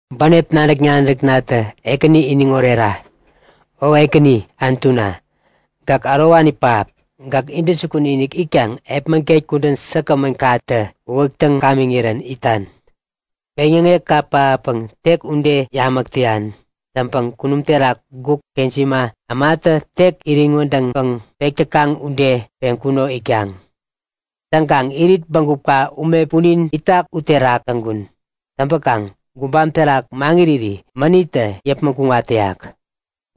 Bänep nadäk-nadäknatä Ekäni iniŋ orera! O Ekäni Anutuna, gäk ärowani pähap. Gäk intäjukun-inik itkaŋ epmäget kudän säkgämän-inikkatä uwäktäŋ gamiŋirän itan. Peŋyäŋekka pähappäŋ tek ude yamäk täyan. Täŋpäŋ kunum terak guk kejima ämatä tek iriŋ wädäŋpäŋ pek täkaŋ ude peŋkuno itkaŋ. Täŋkaŋ irit bägupka ume punin itak u terak täŋkun. Täŋpäkaŋ gubam terak maŋiriri mänittä yäpmäŋ kuŋat täyak.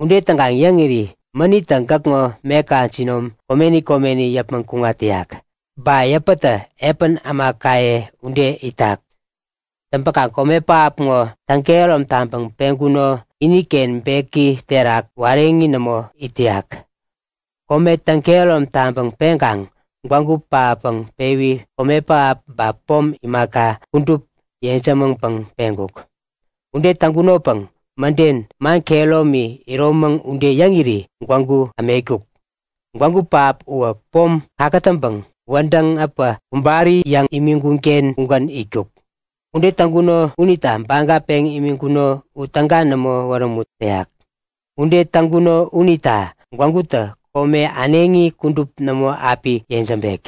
Ude täŋkaŋ yäŋiri mänittä gäkŋo meka jinom komeni komeni yäpmäŋ kuŋat täyak, ba yäpätä epän ämakaye ude itak. Täŋpäkaŋ kome pähap ŋo täŋ-kehärom taŋpäŋ peŋkuno iniken beki terak wareŋi nämo it täyak. Kome täŋ-kehärom taŋpäŋ peŋkaŋ gwägu täŋpäŋ pewi kome pähap ba pom imaka, kudup yejämäŋpäŋ peŋkuk. Ude täŋkunopäŋ mäden man kehäromi, iromäŋ ude yäŋiri gwägu ämetkuk. Gwägu pähap uwä pom kakätäŋpäŋ wädäŋ äpä kubari yäŋ imiŋkunken ugän itkuk. Ude täŋkuno unita baga peŋ imiŋkuno u täga nämo wärämut täyak. Ude täŋkuno unita gwägutä kome äneŋi kudup nämo api yejämbek.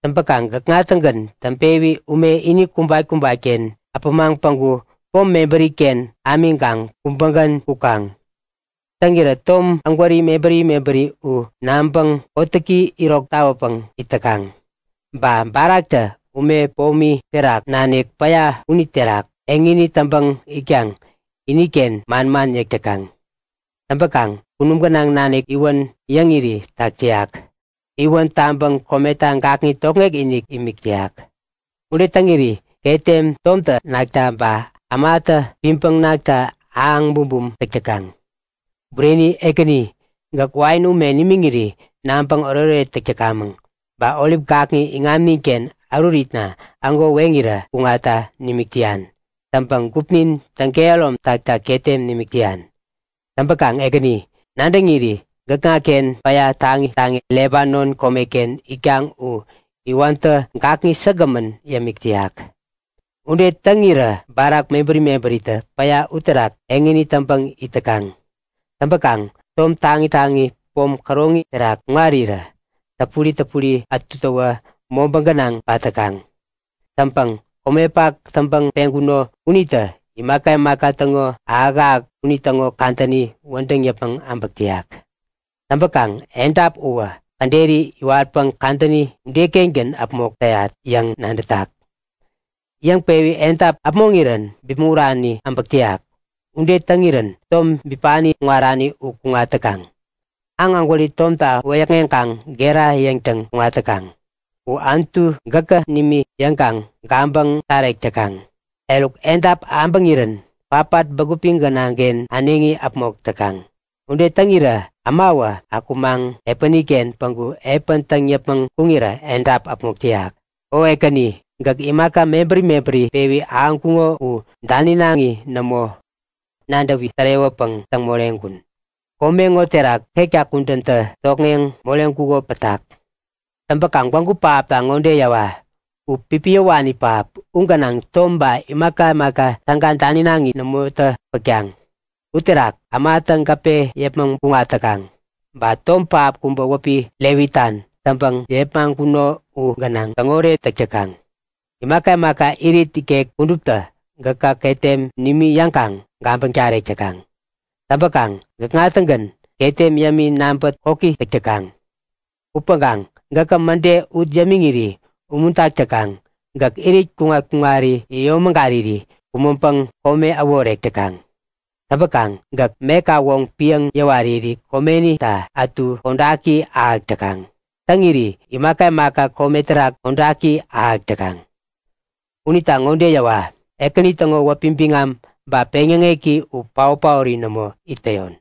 Täŋpäkaŋ gäkŋa-tägän täŋpewi ume ini kubat-kubatken äpämaŋ päŋku pom mebäriken ämiŋkaŋ kubägän kukaŋ. Täŋirä tom ägwäri mebäri mebäri u naŋpäŋ kotäki irok tawäpäŋ it täkaŋ. Ba baraktä ume pomi terak nanik päya uniterak eŋini täŋpäŋ itkaŋ iniken manman yäk täkaŋ. Täŋpäkaŋ kunum gänaŋ nanik iwän yäŋiri tak täyak. Iwän taŋpäŋ kometa gakŋi tokŋek-inik imik täyak. Ude täŋiri ketem tomtä nakta ba ämatä piŋpäŋ nakta ahäŋ bumbum täk täkaŋ. Bureni Ekäni, gäk wain ume nimiŋiri naŋpäŋ oretoret täk täkamäŋ. Ba orip gakŋi iŋamninken äruritna ägo weŋirä kuŋatta nimik täyan. Täŋpäŋ gupnin täŋ-kehärom takta ketem nimik täyan. Täŋpäkaŋ Ekäni, nadäŋiri gäkŋaken päya taŋi taŋi Lebanon komeken itkaŋ u iwäntä gakŋi säkgämän yämik täyak. Ude täŋirä barak mebäri mebäritä päya uterak eŋini täŋpäŋ it täkaŋ. Täŋpäkaŋ tom taŋi taŋi pom käroŋi terak kuŋarirä täpuri täpuri ätutäwä mobä gänaŋ pat täkaŋ. Täŋpäŋ komepak täŋpäŋ peŋkuno unitä imaka imaka täŋo ahäk-ahäk unitäŋo kadäni wädäŋ yäpmäŋ äbäk täyak. Täŋpäkaŋ edap uwä käderi iwatpäŋ kadäni udeken äpmok täyat yäŋ nadätak. Yäŋpewi edap äpmoŋirän bipmäŋurani äbäk täyak. Ude täŋirän tom bipani kuŋarani u kuŋat täkaŋ. Aŋ ägwäri tomta wäyäkŋeŋkaŋ gera yäŋtäŋ kuŋat täkaŋ. U, Anutu gäkä nimi yäŋkaŋ gabäŋ tarek täkaŋ. Eruk edap abäŋirän patpat bägupi, gänaŋken äneŋi äpmok täkaŋ. Ude täŋirä ämawä akumaŋ epäniken päŋku epän täŋ yäpmäŋ kuŋirä edap äpmok täyak. O Ekäni, gäk imaka mebäri mebäri pewi ahäŋkuŋo u daninaŋi nämo. Nadäwi tärewäpäŋ täŋ moreŋkun. Kome ŋo terak ketka kudäntä tokŋeŋ moreŋkuko pätak. Täŋpäkaŋ gwägu pähap ŋode yäwa; U pipiyäwani pähap. U gänaŋ tom ba imaka imaka täga daninaŋi nämotä pätkaŋ. U terak ämatä gäpe yäpmäŋ kuŋat täkaŋ. Ba tom pähap kubä wäpi Levitan täŋpäŋ yepmaŋkuno u gänaŋ täŋoret täk täkaŋ. Imaka imaka irit ikek kuduptä gäkä ketem nimi yäŋkaŋ gabäŋ tarek täkaŋ. Täŋpäkaŋ gäkŋa-tägän ketem yämi naŋpä koki täk täkaŋ. Upäŋkaŋ gäkä mäde ut yämiŋiri umuntak täkaŋ. Gäk irit kuŋat-kuŋari yäyomägariri kumäŋpäŋ kome äworek täkaŋ. Täŋpäkaŋ gäk meka woŋ piäŋ yäwariri komenita ätu kodaki ahäk täkaŋ. Täŋiri imaka imaka kome terak kodaki ahäk täkaŋ. Unita ŋode yäwa; Ekäni täŋo wäpi biŋam ba peŋyäŋeki u paot-paori nämo it täyon!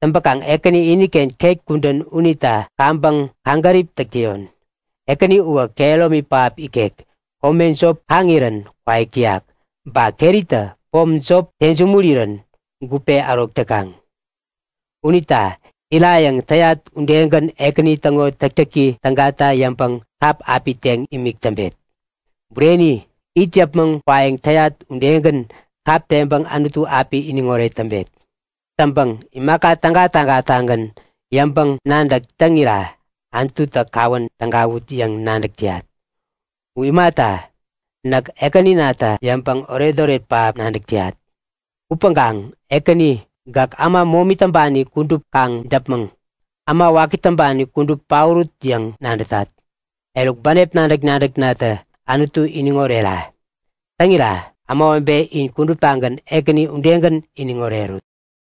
Täŋpäkaŋ Ekäni iniken ket kudän unita kaŋpäŋ kaŋgärip täk täyon. Ekäni uwä kehäromi pähap ikek. Kome jop kaŋirän kwaik täyak. Ba keritä pom jop tensumurirän gupe ärok täkaŋ. Unita irayäŋ täyat udegän Ekäni täŋo täktäki tägata yäŋpäŋ kap api teŋ imik täŋpet. Bureni, it yäpmäŋ kwayäŋ täyat udegän kap teŋpäŋ Anutu api iniŋoret täŋpet. Täŋpäŋ imaka täga-tägatagän yäŋpäŋ-nadäk täŋira Anututä kawän tägawut yäŋ nadäk täyat. U imata, näk Ekäninata yäŋpäŋ oretoret pähap nadäk täyat. Upäŋkaŋ Ekäni, gäk äma momi täŋpani kudup kaŋ däpmäŋ! Äma waki täŋpani kudup paorut yäŋ nadätat! Eruk, Bänep nadäk-nadäknatä Anutu iniŋ orera! Täŋira, ämawebe in kuduptagän Ekäni udegän iniŋ orerut!